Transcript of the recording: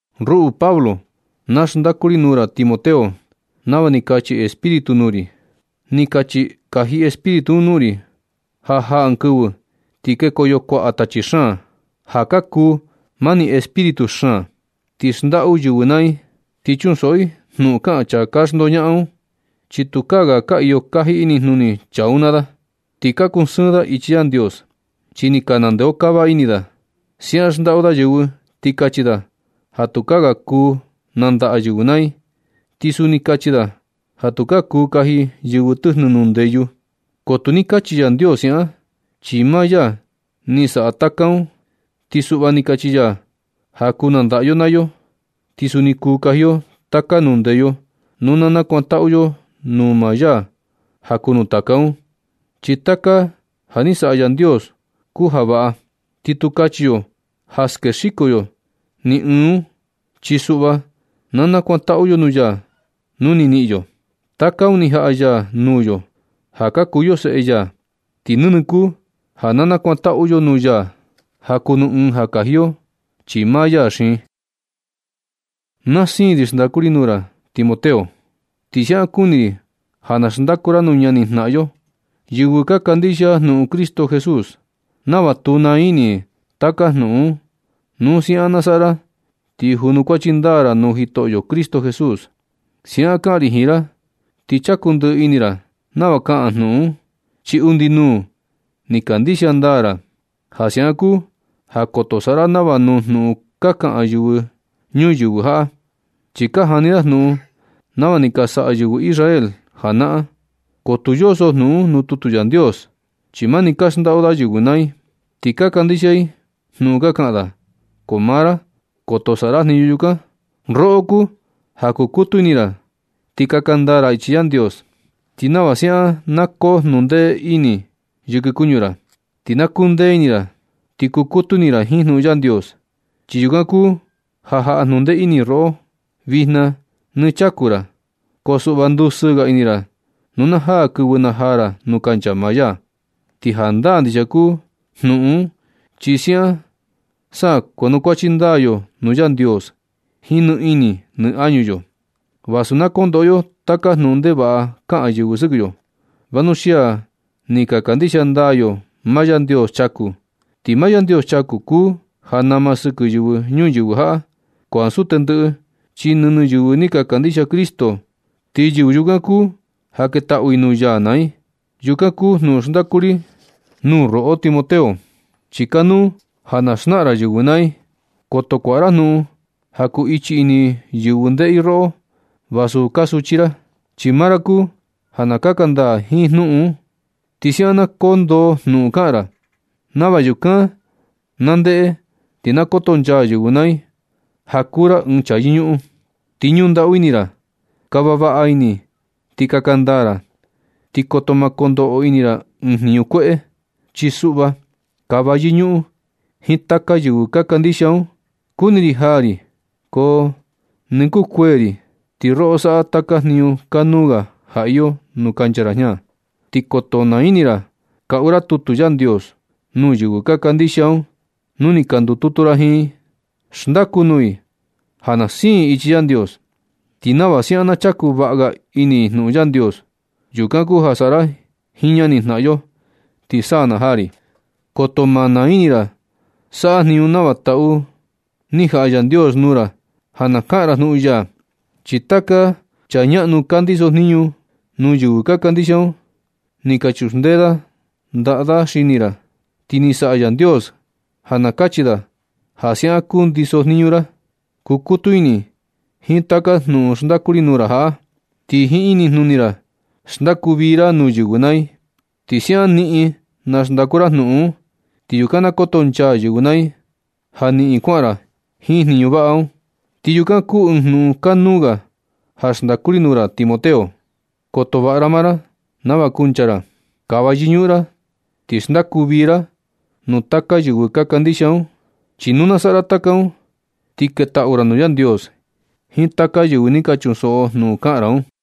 Ruꞌu Pablo, na xndaku ri nuu ra Timoteo nava ni kachi Espíritu nuu ri. Ni kachi kaji Espíritu un nuu ri ja jaa ɨɨn kɨvɨ ti kekoyo kuaꞌa tachi xaan, ja ka kuu mani espíritu xaan, ti xndaꞌu yɨvɨ naa i. Ti chunsoꞌo i jnuꞌun kaꞌan chaa ka xndoñaꞌan un, chi tukaa ga ka iyo kaji inijnuni chaa un naa da. Ni ka kusɨɨn da ichi Yandios, chi ni ka nandeokava ini da. Siaꞌan xndaꞌu da yɨvɨ ti kachi da ja tukaa ga kuu nandaꞌa yɨvɨ naa i. Ti suni kachi da ja tukaa kuu kaji yɨvɨ tɨjnɨ nuu ndeyu. Ko tu ni kachi Yandios siaꞌan, chi maa ya ni saꞌa taka un. Ti suꞌva ni kachi ya ja kuu nandaꞌa yo naa yo, ti suni kuu kaji yo taka nuu ndeyu nu na nakuantaꞌu yo nuu maa ya ja kuu nuu taka un. Chi taka ni ja ni saꞌa Yandios kuu ja vaꞌa, ti tu kachi yo ja skexiko yo ni ɨɨn un. Chi suꞌva na nakuantaꞌu yo nuu ya nu ni niꞌin yo. Taka un ni jaꞌa ya nuu yo ja ka kuu yo seꞌe ya, ti nɨnɨ kuu ja na nakuantaꞌu yo nuu ya ja kuu nuu ɨɨn ja kaji yo, chi maa ya xiin. Na siin ri xndaku ri nuu ra, Timoteo. Ti siaꞌan kuni ri ja na xndaku ra nuu ñani jnaꞌan yo, yɨvɨ ka kandixia jnuꞌun Cristo Jesús, nava tu naa ini i taka jnuꞌun un. Nu siaꞌan na saꞌa ra ti junukuachi ndaa ra nuu Jitoꞌo Cristo Jesús. Siaꞌan kaꞌan ri jiin ra ti chaku ndɨꞌɨ ini ra nava kaꞌan jnuꞌun un, chi undi nuu ni kandixia ndaa ra. Ja siaꞌan kuu ja koto saꞌa ra nava nuu jnuꞌun ka kaꞌan yɨvɨ ñuyɨvɨ jaꞌa, chi ka jani da jnuꞌun nava ni ka saꞌa yɨvɨ Israel janaꞌan, ko tu yoso jnuꞌun un nuu tutu Yandios. Chi mani ka xndaꞌu da yɨvɨ naa i, ti ka kandixia i jnuꞌun ka kaꞌan da. Ko maa ra, koto saꞌa ra jniñu yukan. Roꞌo kuu ja kukutu ini ra ti kaka ndaa ra ichi Yandios. Ti nava siaꞌan na koo jnuꞌun ndee ini yɨkɨ kuñu ra, ti na kuu ndee ini ra ti kuu kutu ini ra jiin jnuꞌun Yandios. Chi yukan kuu ja jaꞌa jnundee ini roꞌo vijna nɨ chaku ra. Ko suꞌva ndusɨɨ ga ini ra nu na jaa kɨvɨ najaa ra nuu kancha maa ya. Ti jandaa ndixia kuu jnuꞌun un chi siaꞌan sa kuanukuachi ndaa yo nuu Yandios jiin nɨ ini nɨ añu yo. Vasu na kondoꞌo yo taka jnuꞌun ndevaꞌa kaꞌan yɨvɨ sɨkɨ yo, vanuxia ni ka kandixia ndaa yo maa Yandios chaku. Ti maa Yandios chaku kuu ja nama sɨkɨ yɨvɨ ñuyɨvɨ jaꞌa, ko ansu tendɨꞌɨ, chi nɨnɨ yɨvɨ ni ka kandixia Cristo ni. Ti yɨvɨ yukan kuu ja ketaꞌu i nuu ya naa i. Yukan kuu jnuꞌun xndaku ri nuu ra, roꞌo Timoteo, chi kanuu ja na xnaꞌan ra yɨvɨ naa i. Koto kuaꞌa ra jnuꞌun ja kuu ichi ini yɨvɨ ndeꞌe i roꞌo vasu kaa suchi ra. Chi maa ra kuu ja na kaka ndaa jiin jnuꞌun un. Ti siaꞌan na koo ndoo jnuꞌun kaꞌan ra, nava yukan na ndeꞌe ti na kotonchaa yɨvɨ naa i ja kuu ra ɨɨn chaa yɨñuꞌun, ti ñuꞌun ndaꞌu ini ra. Kava vaꞌa ini ti kaka ndaa ra, ti koto ma kondoꞌo ini ra ɨɨn jniñu kueꞌe. Chi suꞌva kava yɨñuꞌun jiin taka yɨvɨ ka kandixia un. Kuni ri jaa ri, ko nɨ kuu kuee ri, ti roꞌo saꞌa taka jniñu kanuu ga ja iyo nuu kancha ra jña. Ti koto naa ini ra kaꞌu ra tutu Yandios nuu yɨvɨ ka kandixia un nu ni ka ndututu ra jiin i. Xndaku nuu i ja na siin i ichi Yandios, ti nava siaꞌan na chaku vaꞌa ga ini i jnuꞌun Yandios. Yukan kuu ja saꞌa ra jiin ñani jnaꞌan yo, ti sa na jaa ri. Koto ma naa ini ra saꞌa jniñu nava taꞌu ni jaꞌa Yandios nuu ra ja na kaꞌan ra jnuꞌun ya. Chi taka chaa ñaꞌnu ka ndiso jniñu nuu yɨvɨ ka kandixia un ni ka chuxndee da ndaꞌa da xini ra. Ti ni saꞌa Yandios ja na kachi da ja siaꞌan kundiso jniñu ra. Kukutu ini jiin taka jnuꞌun xndaku ri nuu ra jaꞌa, ti jiin inijnuni ra xndaku vii ra nuu yɨvɨ naa i. Nu siaꞌan niꞌin na xndaku ra jnuꞌun un, ti yukan na kotonchaa yɨvɨ naa i ja niꞌin kuaꞌan ra jiin jniñu vaꞌa un. Ti yukan kuu ɨɨn jnuꞌun kanuu ga ja xndaku ri nuu ra, Timoteo. Koto vaꞌa ra maa ra nava kuncha ra. Kava yɨñuꞌun ra ti xndaku vii ra nuu taka yɨvɨ ka kandixia un. Chi nu na saꞌa ra taka un, ti ketaꞌu ra nuu Yandios jiin taka yɨvɨ ni ka chunsoꞌo jnuꞌun kaꞌan ra un.